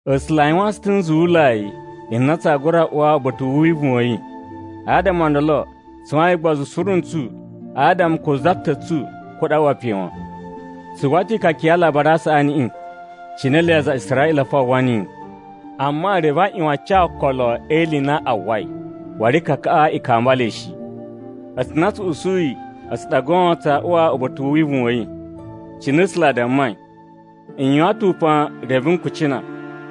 A̱sula̱ a yuwaan tsu ta̱ nzuwulai n na tsaa gura uwa uba̱ta̱ u wivuwun wa̱ yi. Adama o ndolo, tsu yuwain ugbozu suru ntsu adama ko za ta̱ tsu kuɗa̱ a uwa pe wan. Tsu uwwa ta̱ ikaka ya Alabari a Saꞌaniꞌi, cine ele aza a Israꞌila fo a uwwa niyi. Amma reve a ꞌyuwan a ca okolo e ili i na a uwwai, waru ikakaꞌa i kamba le shi. A̱tsu na tsu usuyi a̱tsu ɗa goon tsaa uwa uba̱ta̱ u wivuwun wa̱ yi. Cine A̱sula̱ a dammai, “N yuwan ta̱ upan reve n kucina,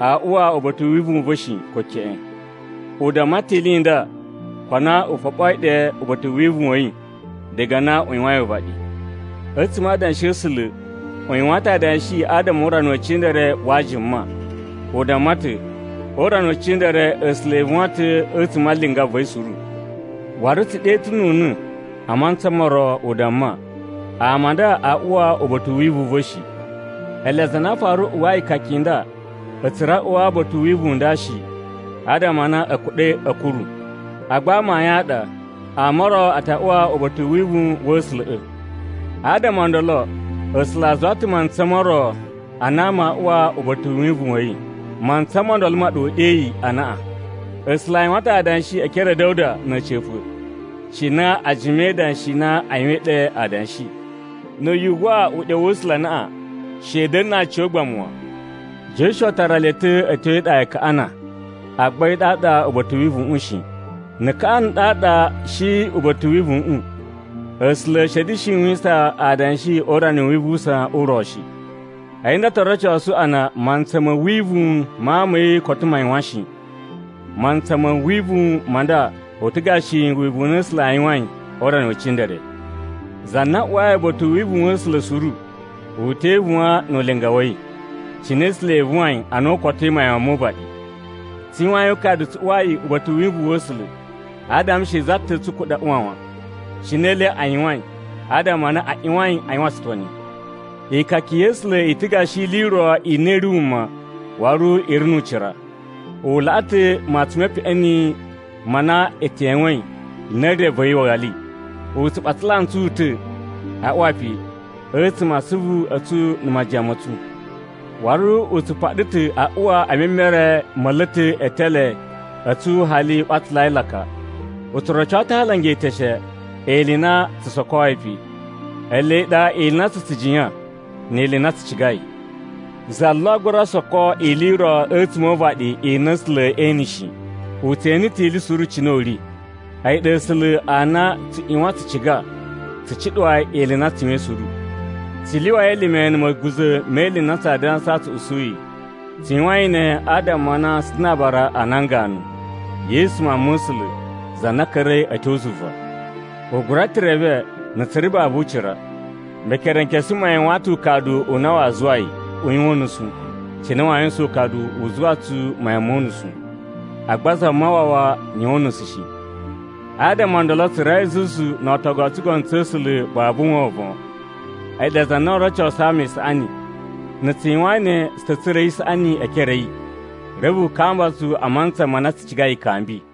‘Aa uwa uba̱ta̱ u wivuwun u va̱ shi, ko keꞌen!’” U damma ta̱ ili i nda ko a na u foɓoi ɗe uba̱ta̱ u wivuwun wa̱ yi diga na u yuwain uvaɗi. A̱tsuma̱ a Adanshi a̱ A̱sula̱, u yuwan ta̱ adanshi adama o urana we cindere wa ajuma, u damma ta̱: “O urana we cindere A̱sula̱ e ivuwan ta̱ a̱tsuma̱ a linga va̱ yi suru.” Waru tsu ɗe ta̱ nu una̱ a mantsa mo ro u damma, “Ama a nda aa uwa uba̱ta̱ u wivuwun u va̱ shi!” Ele aza a na a fara uwwai ikaka i nda, a̱ tsura̱ a̱ uwa uba̱ta̱ u wivuwun u nda shi, adama a na a̱ kuɗa̱i a̱ kuru. Agba amayun a ɗa ama o ro a ta uwa uba̱ta̱ u wivuwun wa̱ A̱sula̱ꞌa̱. Adama o ndolo A̱sula̱ a zuwa ta̱ mantsa mo ro a na ama aa uwa uba̱ta̱ u wivuwun wa̱ yi, mantsa mo ndolo ma ɗa u ɗeyi, “Anaꞌan.” A̱sula̱ a yuwan ta̱ adanshi e ekere a̱ Da̱wuda na̱ a̱ca̱pa̱ cina a jima e idanshi i na a yuwain ɗe adanshi, “Na̱ yu uwwa uɗyo wa̱ A̱sula̱ anaꞌan, she i da̱na̱ na aciyogbamu wan.” Josuwa tara le ta̱ a̱ tyo e iɗa ya Kaꞌana, agba a̱yi ɗaɗa uba̱ta̱ u wivuwuꞌun shi. Na̱ Kaꞌana ɗaɗa shi uba̱ta̱ u wivuwuꞌun, A̱sula̱ a̱ shi a̱ da̱shi yuwisan adanshi o urana u wivuwusan u ro shi. A̱yi nda to rocosu a na mantsa ma̱ wivuwun ma ama a̱ yi koto ma yuwan shi. Mantsa ma̱ wivuwun ma nda u ta̱ gashi wivuwun u na A̱sula̱ a yuwain o urana we cindere. Za na uwai uba̱ta̱ u wivuwun wa̱ A̱sula̱ suru, u te ivuwan nu ulinga wa̱ yi, cine A̱sula̱ e ivuwain ana u kotoi mayan mo uvaɗi. Tsu yuwain ukadu tsu uwai uba̱ta̱ u wivuwun wa̱ A̱sula̱, adama she za ta̱ tsu kuɗa̱ a uwa wan, cine ele a yuwain adama a na a ꞌyuwain a yuwan tsutoni. Ikaka ya̱ A̱sula̱ i ta̱ gashi ili i ro i na i ri wuma waru i ri nu ucira. U laꞌa ta̱ matsun me peꞌeni ma na e tewein na̱ re va̱ yi wali. U tsu ɓatsala ntsu ta̱ a uwa pe, a̱tsuma̱ a asuvu a̱ tsu na̱ majiyan ma̱ tsu. Waru u tsu paɗa ta̱ a uwa e memere ma̱ a̱la̱ta̱ e etele a̱ tsu hali u ɓatsalai laka. U tsu roco ta̱ a alanga e eteshe ili i na tsu sokoi pe, ele ɗa ili i na tsu tsu jiyan ni ili i na tsu cigai. Za lo a gura soko ili i ro a̱tsuma̱ o uvaɗi i na A̱sula̱ ee ene shi. U tse ene ta̱ ili suru cine u ri. A̱yi ɗa A̱sula̱ a na na̱ tsu ꞌyuwan tsu ciga tsu cuɗuwa yi ili i na tsu yuwain suru. Tsu lyuwai elime na̱ ma̱guza̱ me ili i na tsaa dansa tsu usuyi. Tsu yuwain ne adama a na tsu ta̱ na aabara a nan ganu, Yesu Mawun ma̱ A̱sula̱, za na ka̱ra̱i a̱ tyo zuva. U gura ta̱ reve na tsu ri babu ucira. Mekerenkesu ma yuwan ta̱ ukadu u na waa zuwa yi u yuwan unusu cine waa yuwusan ukadu u zuwa tsu mayan mo unusu, agba Zamawawa yuwan unusu shi. Adama o ndolo tsu rawai zuzu no ootogu o tsugono tsa̱ A̱sula̱ babu wovon. A̱yi ɗa za na o rocosu ama isaꞌani. Na̱ tsu yuwain ne, tsu ta̱ tsura̱i isaꞌani e ekere a̱ yi, reve u kamba tsu a mantsa ma na tsu cigai ikambi.